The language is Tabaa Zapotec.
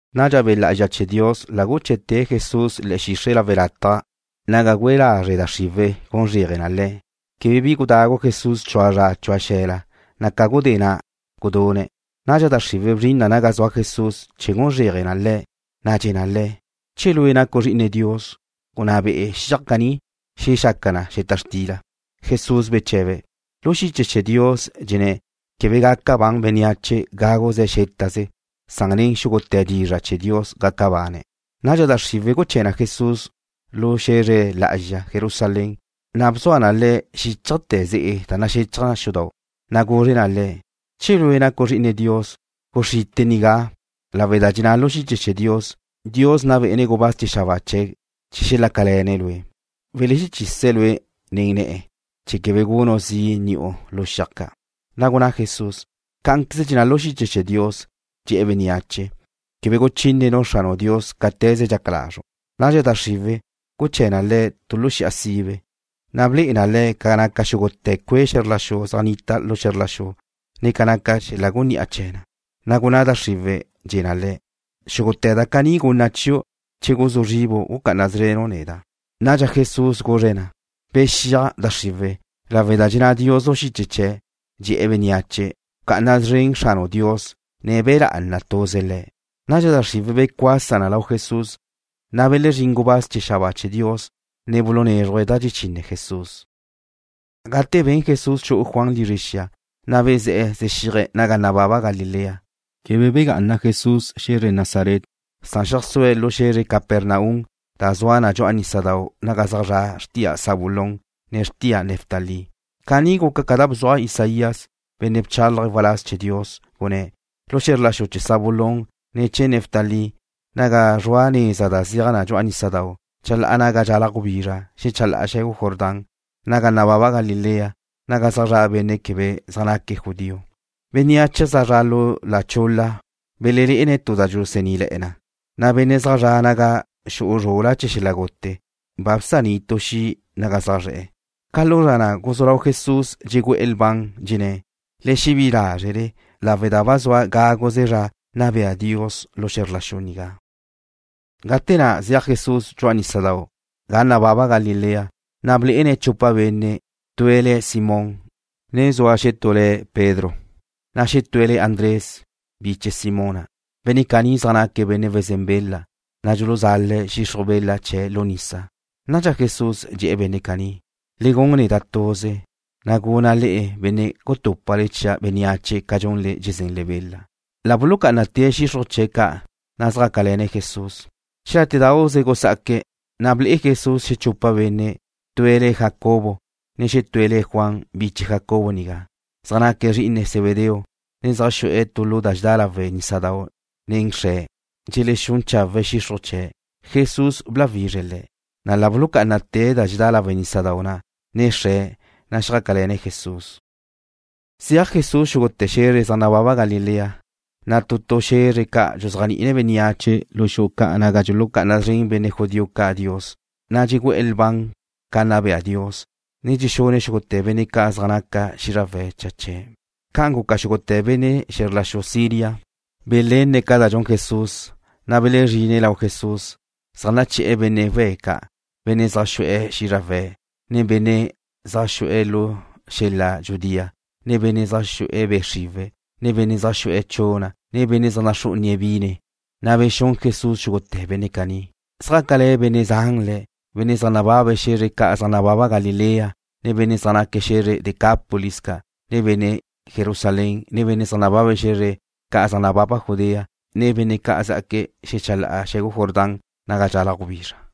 Nadxa Be' Lá'azxa chee̱ Dios la guché̱'te̱' Jesús le̱'e̱ xixre' lawe' lataj naga gúe lazre' da xriwe̱' gun zréaje na Le̱'. Quebe bi gudagu Jesús chua zra chua xe̱la, na' ca gudé na' gudune̱'. Nadxa da xriwe̱' bzrin na naga zua Jesús chee̱ gun zréaje na Le̱', na' dxe̱ na Le̱': ―Che Lue' nacu' Zri'ine Dios, gunná be'e xiaj caní xelexaca na xeta xtila. Jesús beche̱be̱': ―Lu xiche chee̱ Dios dxenné̱': “Quebe gaca ban nu benne' gawe̱' xétaze, san nen xúgute̱ dizra' chee̱ Dios gaca bane̱'.” Nadxa da xriwe̱' guché̱ na Jesús lu xe̱zre lá'azxa Jerusalén, na' bzua na Le̱' xíchajte̱ xudau', na' guzre na Le̱': ―Che Lue' nacu' Zri'ine Dios, guxrite' nigá, lawe' da dxenná lu xiche chee̱ Dios: Dios nna bé'ene̱' gubáz chee̱ xabáa chee̱' ca' chee̱ xelácale̱ne̱' Lue'. Welexechise̱' Lue' nen ne̱'e̱ chee̱ quebe gunu' zi' ni'u lu xiaj ca'. Na' gunná Jesús: ―Cá'anqueze dxenná lu xiche chee̱ Dios, dxe̱'e̱ bénneache: “Quebe guchínenu' Xranu' Dios cáte̱ze dxaca lazru'.” Nadxa da xriwe̱' guché̱ na Le̱' tu lu xi'a sibe, na' ble'e na Le̱' ca naca xúgute̱ cue' xe̱zr la xu zaj nnita lu xe̱zr la xu, ne ca naca xel-la' guni'a chee̱ na. Na' gunná da xriwe̱', dxe̱ na Le̱': ―Xúgute̱ da caní gunna' chiu' che guzú zribu' gucá'ana szrenu' neda'. Nadxa Jesús guzre̱' na: ―Bexíaj, da xriwe̱', lawe' da dxenná Dios lu xiche chee̱', dxe̱'e̱ bénneache: “Bca'ana szren Xranu' Dios, ne be lá'ana tuze Le̱'.” Nadxa da xriwe̱' becuasa na lau Jesús, na' belezrín gubáz chee̱ xabáa chee̱ Dios, ne bulunézruje̱' da dxechine Jesús. Gate ben Jesús xu'u Juan lizre xia, na' bezé̱'e̱ zexíaje̱' naga nababa Galilea. Quebe bga'ana Jesús xe̱zre Nazaret. Xeajsúe̱' lu xe̱zre Capernaum da zua na dxu'a nísadau' naga zaj zra' xrtia Zabulón, ne xrtia Neftalí. Caní guca ca da bzuaj Isaías, benne' bchálaje̱' waláz chee̱ Dios, gunné̱': Lu xe̱zr la xu chee̱ Zabulón, ne chee̱ Neftalí, naga zrua neza da zeaj na dxu'a nísadau', chalá'a naga dxalaj gubizra xechalá'a xe̱gu Jordán. Naga nababa Galilea, naga zaj zra' benne' quebe zaj naque̱' judío. Bénneache zaj zra' lu da chul-la belelé'ene̱' tu da dxusaníle̱'e̱ na, na' benne' zaj zra' naga xu'u zrul-la chee̱ xel-la' gute ba bsaní' tu xi' naga zaj zre̱'e̱. Ca lu zra na' guzú lau Jesús dxegu'e̱ lban, dxenné̱': ―Le xebí'i lázrele, lawe' da ba zua gáguze zra nna bea Dios lu xe̱zr la xu nigá. Gate na' zeaj Jesús dxu'a nísadau' ga nababa Galilea, na' blé'ene̱' chupa benne'. Tue̱' le̱' Simón, ne zua xetú le̱' Pedro, na' xetúe̱' le̱' Andrés, biche Simón na'. Benne' caní zaj naque̱' benne' wezén bela, na' dxuluzale̱' xixruj bela chee̱' lu nisa. Nadxa Jesús dxe̱'e̱ benne' caní: ―Le gun neda' tuze, na' guna' le'e benne' gutúpale chia' bénneache ca dxunle dxezenle bela. La bulucá'anate̱' xixruj chee̱' ca', na' zjácale̱ne̱' Jesús. Xelátedauze gusá'aque̱', na' ble'e Jesús xechupa benne'. Tue̱' le̱' Jacobo, ne xetúe̱' le̱' Juan, biche Jacobo nigá. Zaj naque̱' zri'ine Zebedeo, ne zaj xu'e̱ tu lu da dxedá lawe' nísadau' nen xre̱', dxelexún chawe̱' xixruj chee̱'. Jesús bláwizre̱' le̱', na' la bulucá'anate̱' da dxedá lawe' nísadau' na', ne xre̱', na' zjácale̱ne̱' Jesús. Zeaj Jesús xúgute̱ xe̱zre zaj nababa Galilea, na' tu tu xe̱zre ca' dxuzéajni'ine̱' bénneache lu xu'u ca' naga dxulucá'ana szren benne' judío ca' Dios. Na' dxegu'e̱ lban ca nna bea Dios, ne dxexune̱' xúgute̱ benne' ca' ca zaj naca xízrawe̱' cha chee̱'. Ca'an guca, xúgute̱ benne' chee̱ xe̱zr la xu Siria belenne̱' ca da dxun Jesús, na' belezrine̱' lau Jesús, zaj naché̱'e̱ benne' we̱' ca', benne' zaj xu'e̱ xízrawe̱', ne benne' zaj zue̱' lu xel-la' dxudía, ne benne' zaj xu'e̱ be' xriwe̱', ne benne' zaj xu'e̱ chuna', ne benne' zaj naxrú'unie̱' bine, na' bexún Jesús xúgute̱ benne' caní. Zjácale̱ benne' zan Le̱', benne' zaj nababe̱' xe̱zre ca' zaj nababa Galilea, ne benne' zá'aque̱' xe̱zre Decápolis ca', ne benne' Jerusalén, ne benne' zaj nababe̱' xe̱zre ca' zaj nababa Judea, ne benne' zá'aque̱' xechalá'ala xe̱gu Jordán naga dxalaj gubizra.